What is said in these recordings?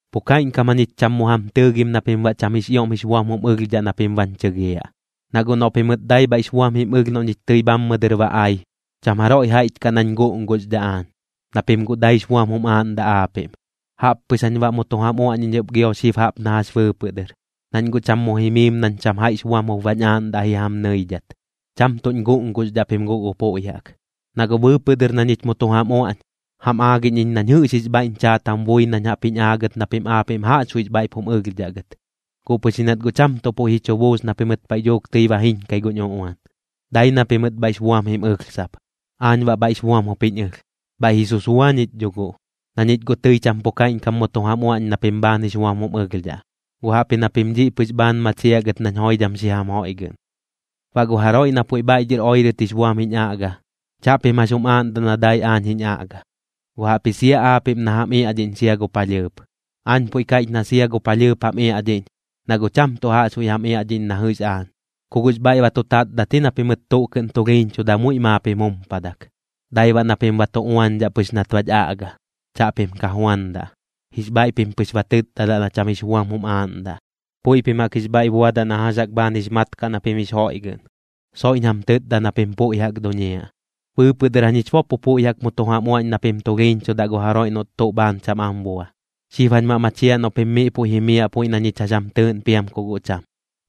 Pu kaiꞌñkam jañich cham mu jam tɨɨgim na pim baꞌ cham jix ioꞌm jix buam jum ɨlhdhaꞌ na pim bañ chɨgiaꞌ. Na guꞌ noꞌ pimɨt dai bhaiꞌx buam jim ɨlh noꞌ ñich tɨi bhammɨ dɨr ba ai, cham jaroiꞌ jaiꞌch kaꞌ nañ guꞌnguxdhaꞌ aañ, na pim guꞌ daix buam jum aaꞌndaꞌ aapiꞌm. Jaꞌp pɨx jañ baꞌ mu tu jam uaꞌñiꞌñ ɨp gio xib jaꞌp na jax bɨɨpɨꞌ dɨr, nañ guꞌ cham mu jimiim nañ cham jaiꞌx buam jup bañ aaꞌndaꞌ ji jam nɨidhat, cham tuꞌñ guꞌnguxdhaꞌ pim guꞌ gu puiꞌ jaꞌk. Na guꞌ bɨɨpɨꞌ dɨr na ñich mu tu jam uaꞌñ, jam aagiꞌñ iñ nañ jɨꞌx jix bhaiꞌñ chaat jam bui nañ jaꞌp jiñ aagɨt na pim aapiꞌm jaꞌxbuiꞌx bhaiꞌp jum ɨlhdhaꞌ gɨt. Guꞌ pɨx ji nat guꞌ cham tuꞌ puiꞌ ji chu buus na pimɨt paiꞌ dhuuk tɨi ba jiñkai guñ uꞌuan, dai na pimɨt bhaiꞌx buam jim ɨlh sap. Aañ baꞌ bhaiꞌx buam jup jiñ ɨlh, bhaiꞌ ji susua ñich dho guꞌ, na ñich guꞌ tɨi cham tuꞌ pu kaiꞌñkam mu tu jam uaꞌñ na pim bhaan jix buam jum ɨlhdhaꞌ, guꞌ jaꞌpji na pim dhiꞌ pɨx bhaan machiaꞌ gɨt nañ joidham xi jam joiꞌgɨꞌn. Baꞌ gu jaroiꞌ na puiꞌ bhaiꞌ dhɨr oirɨt jix buam jiñ aꞌga, chaꞌpim jax jum aaꞌndaꞌ na dai aañ jiñ aꞌga, guꞌ jaꞌpji sia aapiꞌm na jam iaꞌdhiꞌñ sia gu palhɨɨp. Aañ puiꞌ kaiꞌch na sia gu palhɨɨp jam iaꞌdhiꞌñ, na guꞌ cham tuꞌ jaꞌxbuiꞌ jam iaꞌdhiꞌñ na jɨꞌx aañ. Ku guꞌx bhaiꞌ ba tu tatdat ji na pimɨt tuꞌ kɨꞌn tulhiiñchuda muiꞌ maap jim jumpadak. Dai baꞌ na pim ba tu uañdhaꞌ pɨx nat bach aꞌga, chaꞌpim ka juandaꞌ. Jix bhaiꞌ pim pɨx ba tɨtdadaꞌ na cham jix buam jum aaꞌndaꞌ. Puiꞌ pim jaꞌk jix bhaiꞌ buadaꞌ na jax jaꞌk bhaan jix mat kaꞌ na pim jix joiꞌgɨꞌn, soiꞌñ jam tɨtda na pim puiꞌ jaꞌk duñiaꞌ. Bɨɨpɨꞌ dɨr jañich bo pu puiꞌ jaꞌk mu tu jam uaꞌñ na pim tulhiiñchudaꞌ gu jaroiꞌ noꞌt tuꞌ bhaan cham am bua, xib jañ baꞌ machiaꞌ noꞌ pim miꞌ puiꞌ jimiaꞌ puiꞌ na ñich jax jam tɨɨꞌn piam ku guꞌ cham.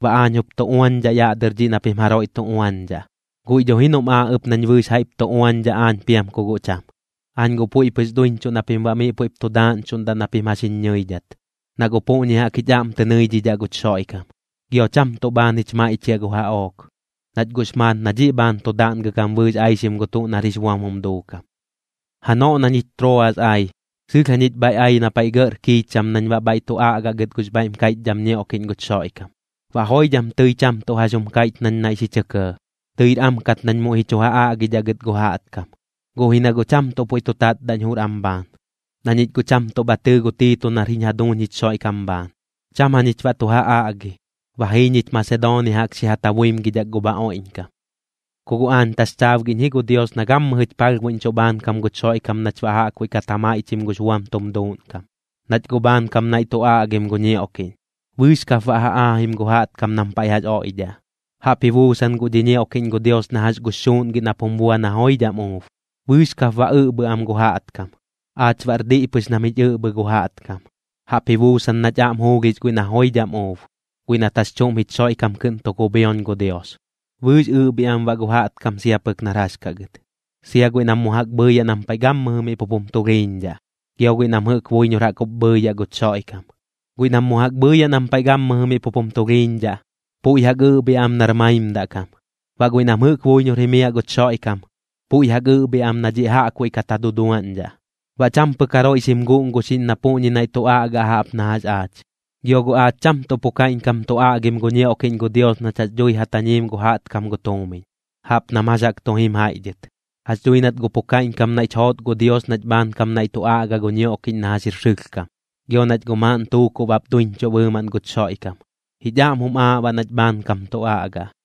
Baꞌ aañ jup tu uañdhaꞌ yaꞌ dɨr dhiꞌ na pim jaroiꞌ tu uañdhaꞌ, guiꞌ dho ji noꞌm aaꞌ ɨp nañ bɨɨx jaiꞌp tu uañdhaꞌ aañ piam ku guꞌ cham. Aañ guꞌ puiꞌ pɨx duiñchuꞌ na pim baꞌ miꞌ puiꞌp tu daaꞌñchuꞌndaꞌ na pim jax jiñ ñɨidhat, na guꞌ puꞌñi jaꞌk jich aꞌm tɨ nɨidhidhaꞌ guch Xoiꞌkam. Gio cham tuꞌ bhaan jich maiꞌchiaꞌ gu jaꞌook, nach guꞌx maat na dhiꞌ bhaan tu daꞌngɨ gam bɨɨx aixim gu tuꞌ nar jix buam jum duukam. Janoꞌ na ñich Trooas ai, sɨlh jañich bhaiꞌ ai na paiꞌ gɇꞌr kiicham nañ baꞌ bhaiꞌ tu aꞌgaꞌ gɨt gux bhaiꞌm kaiꞌchdham ñioꞌkiꞌñ guch Xoiꞌkam. Baꞌ joidham tɨi cham tuꞌ jax jum kaiꞌch nañ naiꞌ xi chɇ kɇɇ, tɨir am kat nañ muiꞌ ji chu ja aꞌgidhaꞌ gɨt gu jaꞌtkam. Guꞌ ji na guꞌ cham tuꞌ puiꞌ tu tatdaꞌñ jur am bhaan, na ñich guꞌ cham tuꞌ bha tɨɨ gu Tiito nar jiñ jaduuñ jich Xoiꞌkam bhaan. Cham jañich baꞌ tu ja aꞌgi, ba jii ñich Masedoonia jaꞌk xi ja tabuimgidhak gu bha oiꞌñkam. Ku guꞌ aañ taxchaabgiꞌñ ji gu Dios na gammɨjɨch palhbuiꞌñchuꞌ bhaankam guch Xoiꞌkam nach baꞌ jaꞌkbuiꞌ kat ja maiꞌchim gux buam tum duuꞌnkam, nach guꞌ bhaankam naiꞌ tu aꞌgim gu ñioꞌkiꞌñ, bɨɨx kap baꞌ ja aajim gu jaꞌtkam nam paiꞌ jax oiꞌdhaꞌ. Jaꞌp ji buusan guꞌ dhi ñioꞌkiꞌñ gu Dios na jax gux xuuꞌngi nap jum bua na joidham uub, bɨɨx kap baꞌ ɨꞌbhim am gu jaꞌtkam. Aach baꞌr diꞌ pɨx nam jich ɨꞌbhɨ gu jaꞌtkam, jaꞌp ji buusan nach aꞌm juulhix guiꞌ na joidham uub, guiꞌ nat jax chuꞌm jich Xoiꞌkam kɨꞌn tu kubhioñ gu Dios. Bɨɨx ɨꞌbhiaꞌ am baꞌ gu jaꞌtkam sia pɨk nar jax kaꞌ gɨt, sia guiꞌ nam mu jaꞌk bhɨiyaꞌ nam paiꞌ gammɨjɨ miꞌ pup jum tulhiiñdhaꞌ, gio guiꞌ nam jɨꞌk buiñor jaꞌk jup bhɨɨyaꞌ guch Xoiꞌkam. Guiꞌ nam mu jaꞌk bhɨɨyaꞌ nam paiꞌ gammɨjɨ miꞌ pup jum tulhiiñdhaꞌ, puiꞌ jaꞌk ɨꞌbhiaꞌ am nar maimdaꞌ kam, baꞌ guiꞌ nam jɨꞌk buiñor jimiaꞌ guch Xoiꞌkam, puiꞌ jaꞌk ɨꞌbhiaꞌ am na dhiꞌ jaꞌkbuiꞌ kat ja duduaꞌñdhaꞌ. Baꞌ cham pɨk jaroiꞌ xim guꞌnguxiꞌñ na puꞌñi naiꞌ tu aꞌgaꞌ jaꞌp na jax aach. Gio guꞌ aach cham tuꞌ pu kaiꞌñkam tu aꞌgim gu ñioꞌkiꞌñ gu Dios nach jax dhui ja tañiim gu jaꞌtkam gu tuumiñ, jaꞌp nam jax jaꞌk tu jim jaiꞌ dhɨt. Jax dhui nat guꞌ pu kaiꞌñkam naiꞌch joot gu Dios nach bhaankam naiꞌ tu aꞌgaꞌ gu ñioꞌkiꞌñ na jax jir sɨlhkam. Gio nach guꞌ maaꞌn tuukuꞌ bap duiñchuꞌ bɨɨmaꞌn guch Xoiꞌkam, jich aꞌm jum aaꞌ baꞌ nach bhaankam tu aꞌgaꞌ.